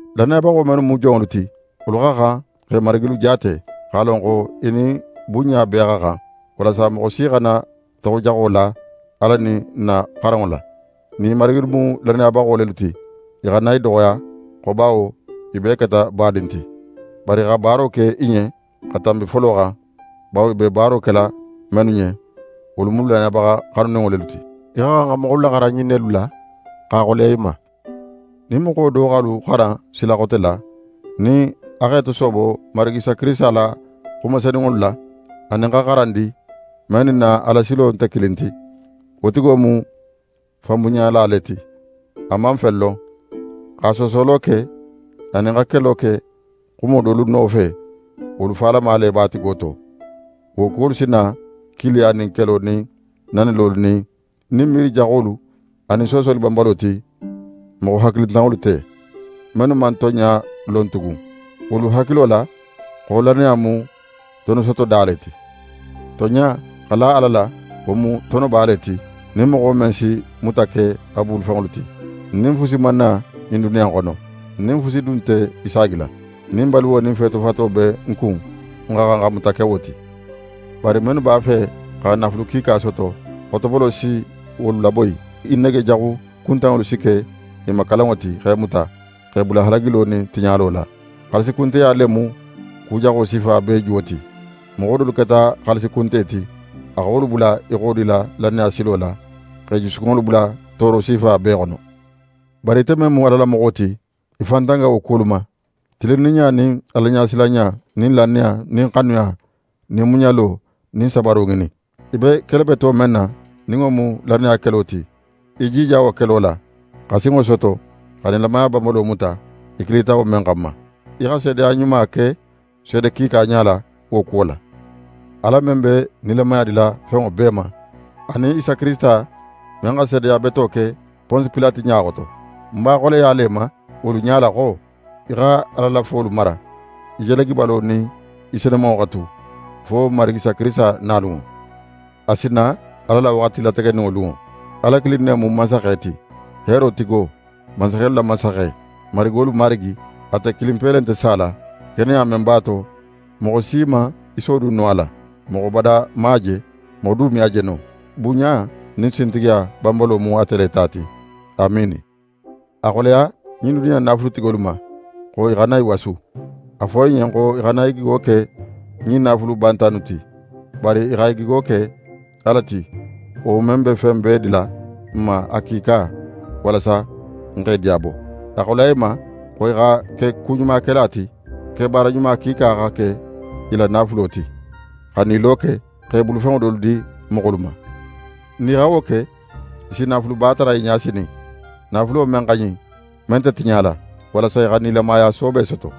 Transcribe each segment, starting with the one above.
Lannayabaxo mennu mu jonŋolu ti, wolu xa xan x'e marigilu jaate, x'a lon xo i nin bunɲa bee xa xan; walasa moxo si xana toxojaxo la Ala nin n na xaranŋo la. Nin i marigilu mu lannayabaxo lelu ti, i xana i doxoya xo bawo i bee keta badin ti, bari i xa baaro ke i ɲen xa tanbi folo xan, bawo i be baaro kela mennu ɲen, wolu mu lannayabaxa xanuninŋo lelu ti. Í xa xan xa moxolu laxaran ɲin nelu la, x'a xoleya i ma. Nin moxo do x'alu xaran sila xote la, nin a x'é tosoobo Marigi Isa Kirisita la xuma senunŋolu la, anin xa xaran di, men nin n na Alasilo nte kilin ti, wo tigo mu fanbunɲala le ti. A man fen lon. Xa soosolo ke, anin xa kelo ke xumo dolu nofe, wolu falama le b'a tigo to. Wo kuwolu si na kiiliya nin kelo nin nanilolu nin miiri jaxolu, anin soosoli banbalo ti moxo hakilintanŋolu te, mennu man tonɲa lon tugun. Wolu hakilo la xo lannaya mu tonosotoda le ti. Tonɲa, xa la Ala la, wo mu tonoba le ti, nin moxo men si muta ke a bulufenŋolu ti. N nin fusi man na ɲin duniya in xono. N nin fusi du nte i saagila. Nin baluwo nin feetofato be n kun, n xa xan xa muta ke wo ti. Bari mennu b'a fe xa naafulu kiika soto, xotobolo si wolu laboyi. I nege jaxu kuntanŋolu si ke i ma kalanŋo ti, x'e muta, x'e bula halagilo nin tiɲalo la. Xaalisikunteya le mu ku jaxo sifa bee juwo ti. Moxo dolu keta xaalisi kunte ti, a xa wolu bula i xodila lannaya silo la, x'e jusukunŋolu bula tooro sifa bee xono. Bari ite men mu Ala la moxo ti, í fan tanga wo kuwolu ma. Tilinninɲa nin Alaɲasilanɲa nin lannaya nin xanuya nin muɲalo nin sabaro ŋinin. Í be kele beto men na, nin wo mu lannaya kelo ti, í jija wo kelo la, xa sinŋo soto, xa nilamaya banbalo muta, í kilita wo men xanma. Í xa seedeya ɲuma ke seede kiika ɲala wo kuwo la. Ala men be nilamaya dila fenŋo bee ma, anin Isa Kirisita men xa seedeya beto ke Ponsi Pilate ɲa xoto, ń b'a xoleyala í ma wolu ɲala xo, í xa Ala la folu mara, í jalagibalo nin í senumanŋo xa tu, fo n Marigi Isa Kirisita nalunŋo. A si na Ala la waxati lategeninŋo lunŋo. Ala kilin ne mu Mansaxe ti; heero tigo, mansaxelu la Mansaxe, marigolu Marigi. Ate kilinpe le nte sala; keneya men b'a to, moxo si man í sodun no a la. Moxo bada man a je. Moxo du me a je no. Bunɲa nin sintigiya banbalo mu ate le ta ti. Amiini. A xoleya ɲin duniya in naafulutigolu ma xo i xana i wasu. A fo i ɲen xo i xana i gigo ke ɲin naafulu banta innu ti, bari i xa i gigo ke Ala ti, wo men be fen bee dila n ma a kiika, walasa n x'e diyabo. A xoleya i ma, xo i xa ke ɲumakela ti, kebaara ɲuma kiika xa ke i la naafulo ti, xa nilo ke, x'e bulufenŋo dolu di moxolu ma. Nin i xa wo ke, i si naafuluba tara i ɲa sinin, naafulo men xa ɲin, men nte tiɲala, walasa i xa nilamaya soobe soto.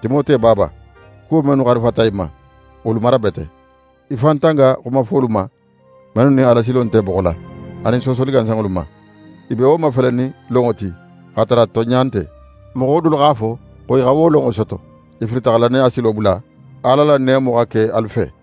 Timote baaba, kuwo mennu xarifata í ma, wolu mara bete. Í fan tanga xuma fuwolu ma, mennu nin Alasilo nte boxo la, anin soosoli gansanŋolu ma. I be wo mafelenin lonŋo ti, x'a tara tonɲa nte. Moxo dolu x'a fo xo i xa wo lonŋo soto. I filita xa lannaya silo bula. Ala la neemo xa ke alu fe!